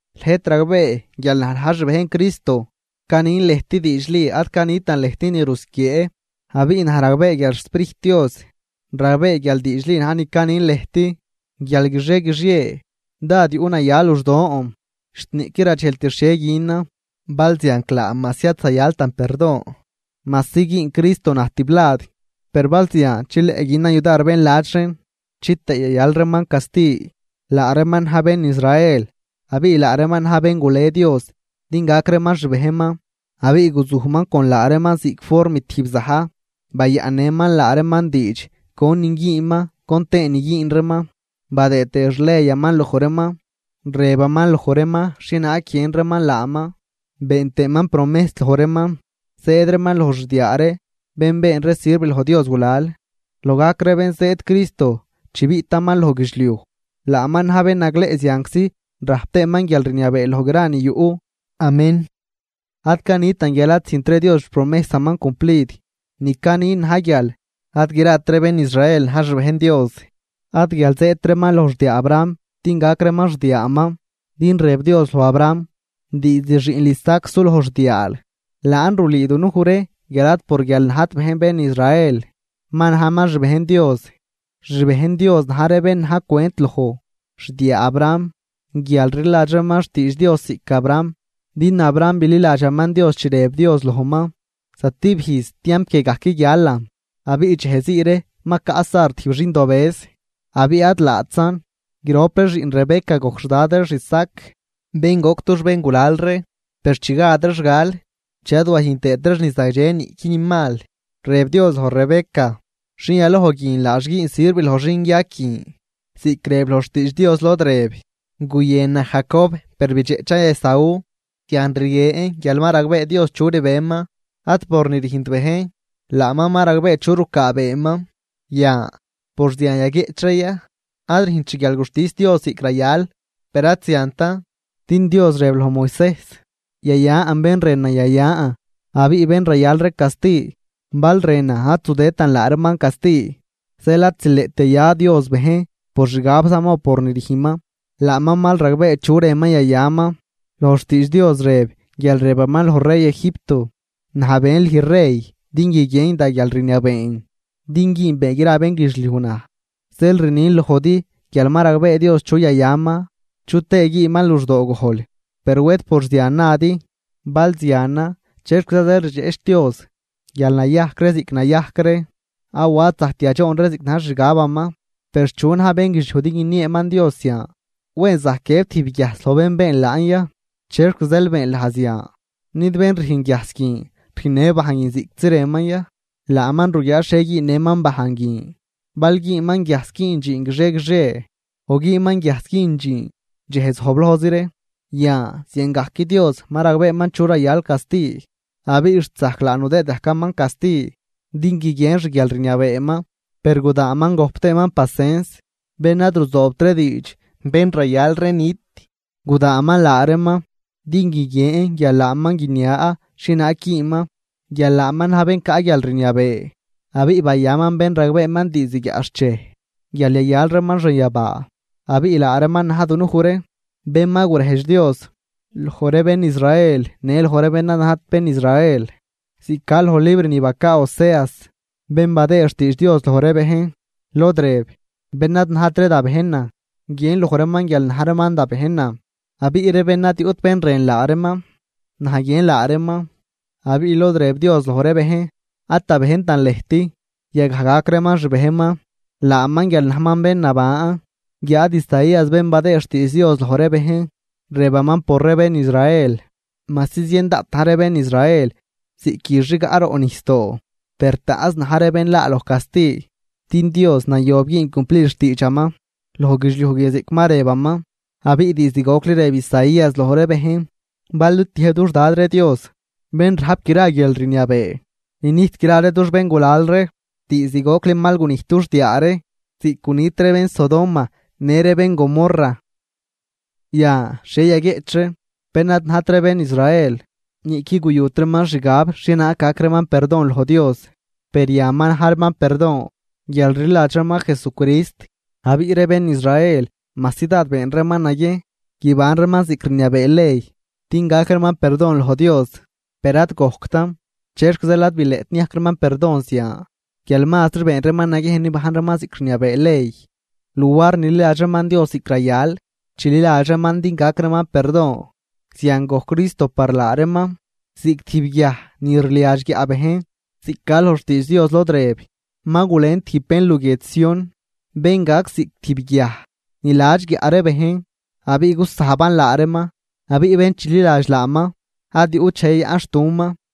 Lëjt ragbee guial naj na̱j xbejn Cristo, canin lëjt diidxli ad canitan lëjt ni rusquiee. Abiꞌ naj ragbee guial xSprijt Dios ragbee guial diidxli na̱j ni canin lëjt, guial guixie guixie dád yuꞌnaya luxdoon, xt niꞌquid radxejlt xhie günan. Balzianclaa majsi ad zayaltan perdon, majsi güün Cristo naj tiblad, per bal zian chileꞌ günan yudar bén ladx reen chitëë yayal reeman casti. Laa reeman na̱j bén Israel, abiꞌ laa reeman na̱j bén gule Dios din gac reeman xbejnman. Abiꞌ guzujman con laa reeman ziꞌc form tijb za̱j, bayaꞌnnëman laa reeman diidx conin güünman con tëënin güün reeman, badëë tëë xleyaman loj reeman. Rëbaman loj reeman xhienaag guiën reeman laaman, been tëëman promejs loj reeman. Zëëd reeman loj xdiaa ree bén been ree sirv loj Dios gulal, loj gajc ree bén zëëd Cristo chi biꞌtaman loj guidxliuj, laaman na̱j bén nagleꞌ zianczi rajp tëëman guialrniabee loj gra ni yuꞌ. Amén. Ad canitan guial ad züjntri Dios xpromejsaman cumplid, ni canin na̱j guial ad grat ree bén Israel na̱j xbejn Dios. Ad guial zëëdt reeman loj xdiaa Abraham din gac reeman xdiaaman, din rëb Dios loj Abraham: “Diizd xiꞌnl Isaac suloj xdiaal.” Laan rulüü dunuj ree guial ad por guial najt bejn bén Israel, ma najman xbejn Dios, xbejn Dios na̱j ree bén na̱j cwent loj xdiaa Abraham guial rliladx reeman xtiidx Dios ziꞌc Abraham. Din Abraham bililadxaman Dios chi rëb Dios lojman: “Zatib ijz tiamp guie gajc guialan abiꞌ dxej zii ree ma caꞌ Sar tijb xindobëz.” Abiꞌ ad laatzan. Grop ree xiꞌn Rebeca gojc xdad reex Isaac, bén goc dux béngulal ree, per chi gad reex gal, chi ad wayüjn tëët reex ni zagdxe niꞌqui ni mal, rëb Dios loj Rebeca: “Xin yaloj guin laax güün sirv loj xinguiag guin.” Ziꞌc rëb loj xtiidx Dios lod rëb: “Guyënan Jacob, per bidxeꞌchan Esaú.” Zian rguien guial ma ragbee Dios chu rbeman ad por ni rüjnt bejn, laaman ma ragbee chu rucaabeeman. Yan, ¿por zian yaguieꞌch ree ya, ad rüjnt xguialguxtis Dios ziꞌc rayal? ¡Per ad ziantan! Din Dios rëb loj Moisejs: “Yayan bén rënan yayan abiꞌ bén rayal ree casti, bal rënan ad zudëëdtan laa reeman casti.” Zeel ad zileꞌt yaya Dios bejn por xixgabzaman o por ni rüjnman, laaman mal ragbee chu rënman yayaman. Loj xtiidx Dios rëb guial rëbaman loj rey Egipto: “Naj ben lüj rey din guiguien da guialrniabeen din güünbee gra bénguidxliuj naj.” Zeel rnin lojdi guial ma ragbee Dios chu yayaman chu tëë güünman luxdoo gojl. Per wed por zian nadi: “Bal zianan, ¿chexquiza zeel rdxeꞌch Dios guial nayajc ree ziꞌc nayajc ree awa ad zajct yadxoon ree ziꞌc na̱j xixgabaman?” Per, ¿chu na̱j bénguidxliuj din guinieeman Dios zian? Wen zajc guiëb tijb guiajs loj bén been laan ya: “¿Chexc zeel beenl naj zian?” ¿Nid bén rüjn guiajs guin rüjnnë bajn guin ziꞌctzi rënman ya? Laaman ruguiaa xhie güünnëman bajn guin, bal güünman guiajs güün dxiin guixie guixie o güünman guiajs güün dxiin dxej zojblojzi ree. Yan, ziangajc Dios ma ragbeeman chu rayal casti, abiꞌ xt zajc laa nudëëd gajcaman casti din guiguien xguialrniabeeman. Per gudaanman gojp tëëman pacens bén ad ruzoobt ree diidx, bén rayal ree nit. Gudaanman laa reeman din guiguien guial laaman guinia xhienaag güünman, guial laaman na̱j bén caꞌ guialrniabee abiꞌ bayaman bén ragbeeman diizd guiaꞌxchej guial yayal reeman xanyabaa. Abiꞌ laa reeman na̱j dunuj ree bén ma gurejdx Dios, loj ree bén Israel në loj ree bén ad najt bén Israel. Ziꞌc ca loj libr ni bacaa Oseas bén badëë xtiidx Dios loj ree bejn, lod rëb: Bén ad najt ree da bejnan, guiën loj reeman guial na̱j reeman da bejnan, abiꞌ ree bén ad yuꞌt bén rën laa reeman, naj guiën laa reeman. Abiꞌ lod rëb Dios loj ree bejn: “Ad da bejntan lëjt”. Yagaj gac reeman xbejnman, laaman guial najman bén naban. Guiáad Isaías bén badëë xtiidx Dios loj ree bejn, rëbaman por ree bén Israel: “Majsi zien daꞌt na̱j ree bén Israel ziꞌc üx rigaꞌ roꞌ nijsdoo, per taꞌnz na̱j ree bén laa loj casti, din Dios nayob güün cumplid xtiidxaman loj guidxliuj guie ziꞌc ma rëbaman.” Abiꞌ diizd gocli rëb Isaías loj ree bejn: Bal nitiëjb dux Dad ree Dios bén rajp gra guialrniabee ninijt gra ree dux béngulal ree, diizd gocli mal gunijt dux diaa ree ziꞌc gunit ree bén Sodoma në ree bén Gomorra. Yan, ¿xhie yaguieꞌch ree? Bén ad najt ree bén Israel niꞌquid guyut reeman xgab xhienaag gac reeman perdon loj Dios, per yan ma na̱j reeman perdon guial rliladx reeman Jesucrist. Abiꞌ ree bén Israel majsi dád been reeman naguiejn guiban reeman ziꞌc rniabee ley din gac reeman perdon loj Dios, per ad gojctan. ¿Chexc zeel ad bileꞌt niajc reeman perdon zian? Guial mazri been reeman naguiejn nibajn reeman ziꞌc rniabee ley luar nililadx reeman Dios ziꞌc rayal chililadx reeman din gac reeman perdon. Zian gojc Cristo par laa reeman ziꞌc tijb “guiaj ni rliadx guiaꞌ bejn” ziꞌc ca loj xtiidx Dios lod rëb: Ma gulen tijb bejn luguiedx Sión, bén gac ziꞌc tijb guiaj ni ladx guiaꞌ ree bejn abiꞌ gusajban laa reeman. Abiꞌ bén chililadx laaman ad yuꞌt dxej yayaꞌnxtuman.